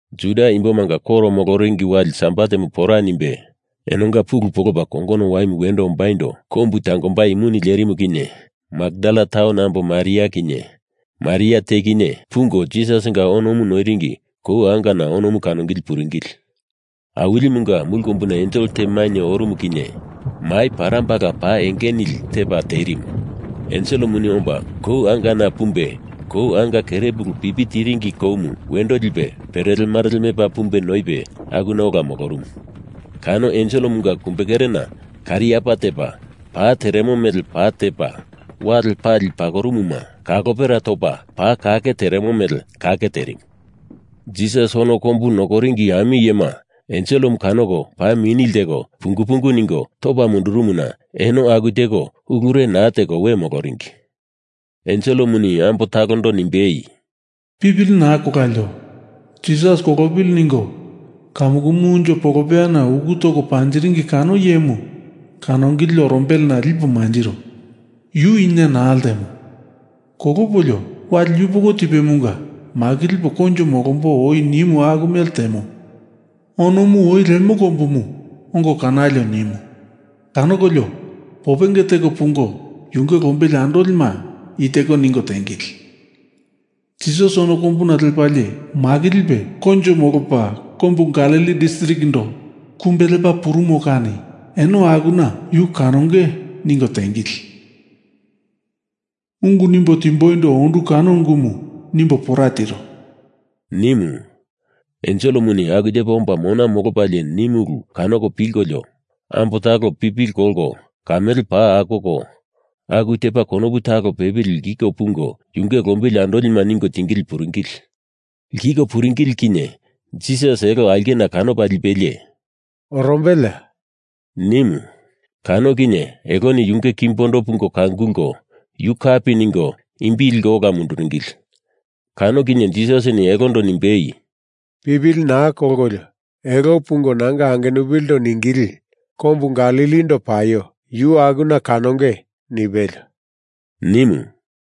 Juda imbomanga koro moloringi wali Sabatemu pora nimbe, enonga pulu polopa kongono waimu wendo ombaindo kombu tangombai muni lerimu kinye Makdala taun ambo Maria kinye, Maria te kinye, pungo Jisasinga onomu noiringi kou angana onomu kanongili puringili. Awilimunga mulu kombuna ensel te mainye orumu kinye mai parambala paa enge nili tepa terimu. Enselemuni omba kou angana pumbe kou anga kerepulumu pipi tiringi koumu wendo lipe perelemarele mepa pumbe noipe akuna ola molorumu. Kano enselemunga kumbekeremu kariapa tepa pa teremo mele pa tepa, wale pali pakorumuma kalopera topa paa kake teremo mele kake terimu. Jisas ono kombu nokoringi ami iyema enselemu kanoko paa mini lteko pungu pungu ningo topa mundurumuna eno aku teko ulure naa teko we moloringi. Enselemuni ambo talondo nimbei, “Pipili naa kolalio. Jisas kolopili ningo kamukumu unjo polopeyana uku toko panjiringi kano iyemu kanongili orombelena lipo manjiro. Yu ina naa ltemo. Kolopolio, wali yupoko tipemunga makilipo koinjo molombo oi nimu aku mele temo. Onomu oi lemo kombumu ongo kanalio,” nimu. Kanokolio popenge teko pungo yunge lombili andolima i teko ningo tiengili ‘Jisas ono kombuna lepalie makilipe koinjo molopa kombu Galili distrikindo kumbe lepa purumo kani eno akuna yu kanonge,’ ningo tiengili. Ungu nimbo tindimboindo ondu kano ungumu nimbo pora tiro,” nimu. Enselemu aku tepa omba mona molopalie nimu ulu kanoko pilkolio ambo talo pipili kolko kamele paa akoko, aku tepa konopu talo pepili lkiko pungo yunge lombili andolima ningo tingili puringili. Lkiko pungili puringili kinye Jisas elo aulkena kanopa lipelie “Orombeleya?” nimu. Kano kinye eloni yunge kimbondo pungo kangulko yu kapi ningo imbi liko ola munduringili. Kano kinye Jisasini elondo nimbei, “Pipili naa kolkolio, elo pungo nanga angenupilindo ningili, ‘Kombu Galilindo paio. Yu akuna kanonge,’ nipelio,” nimu.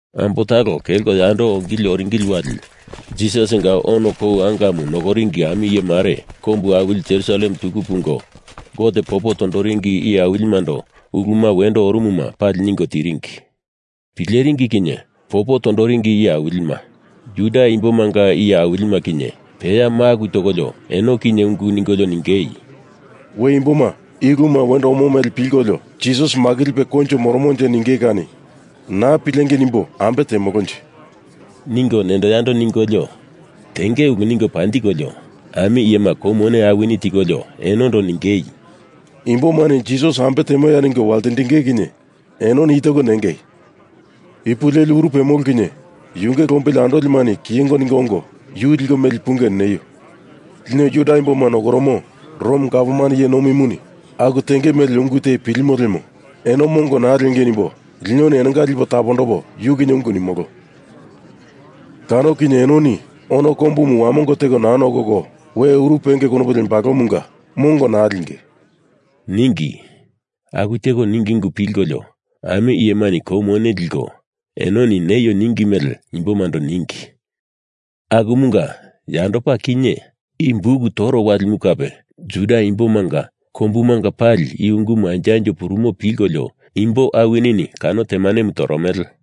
Ambo talo kelko yando ongili oringili wali Jisasinga ono kou angamu nokoringi ami iye mare kombu awili Jerusalem tuku pungo Gote popo tondoringi iye awilimando uluma wendo orumuma pali ningo tipuringi. Pileringi kinye popo tondoringi iye awilima, Juda imbomanga iye awilima kinye peya maku tokolio eno kinye ungu ningolio ningei, “We imboma i uluma wendo omo mele pilkolio Jisas makilipe koinjo moromonje ninge kani naa pilengei nimbo ambe temolonje?” ningo nendo yando ningolio tenge ulu ningo panjikolio, ami iyema kou mone awini tikolio enondo ningei, “Imbomani Jisas ambe temoya ningo waltindinge kinye enoni i teko nengei, ‘Ipu leli uru pemolo kinye yunge lombili andolimani kiyengo ningo ongo yu liko meli punge,’ neio. Lino Juda imboma nokoromo Rom gavman iye nomimuni aku tenge mele ungu te pilimo lemo eno mongo naa liengei nimbo linoni enonga lipo tapondopo yu kinye ungu nimolo. Kano kinye enoni ono kombumu wamongo teko naa nokoko we uru penge konopu lembalomunga mongo naa linge,” ningi. Aku teko ningi ungu pilkolio ami iyemani kou mone liko enoni neio ningi mele imbomando ningi. Akumunga yandopa kinye, i buk toro walimu kape Juda imbomanga kombumanga pali i ungumu anjo anjo purumo pilkolio imbo awinini kano temanemu toromele.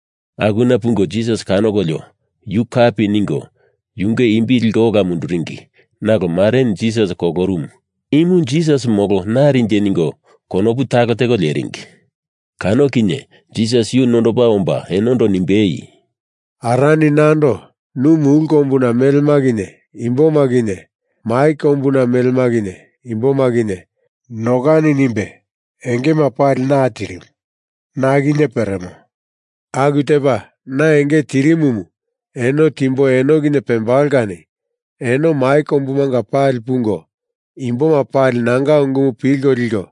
Akuna pungo Jisas kanokolio, yu kapi ningo yunge imbi liko ola munduringi nalo mareni Jisas kolorumu, imu Jisas molo narinje ningo konopu talo teko leringi. Kano kinye Jisas yu nondopa omba enondo nimbei, “Arani nando nu mulu kombuna melema kinye imboma kinye, mai kombuna melema kinye imboma kinye nokani nimbe engema pali na tirimu, na kinye peremo. Aku tepa na enge tirimumu eno timbo eno kinye pembalo kani eno mai kombumanga pali pungo imboma pali nanga ungumu pilko liko,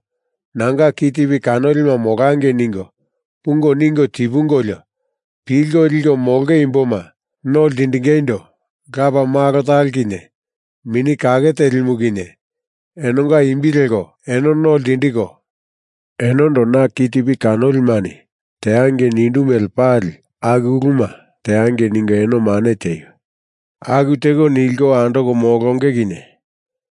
nanga kitipi kanolima molangei ningo, pungo ningo tipungolio, pilko liko molonge imboma no ltindingeindo Lapa Malo talo kinye Mini Kake Telimu kinye enonga imbi leko eno no ltindiko, enondo na kitipi kanolimani teangei nindu mele pali aku uluma teangei ningo eno mane tieio. Aku teko nilko andoko molonge kinye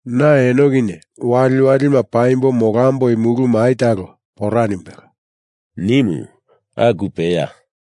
na eno kinye waliwalima paimbo molamboi mulu mai talo pora nimbelo,” nimu. Aku peya.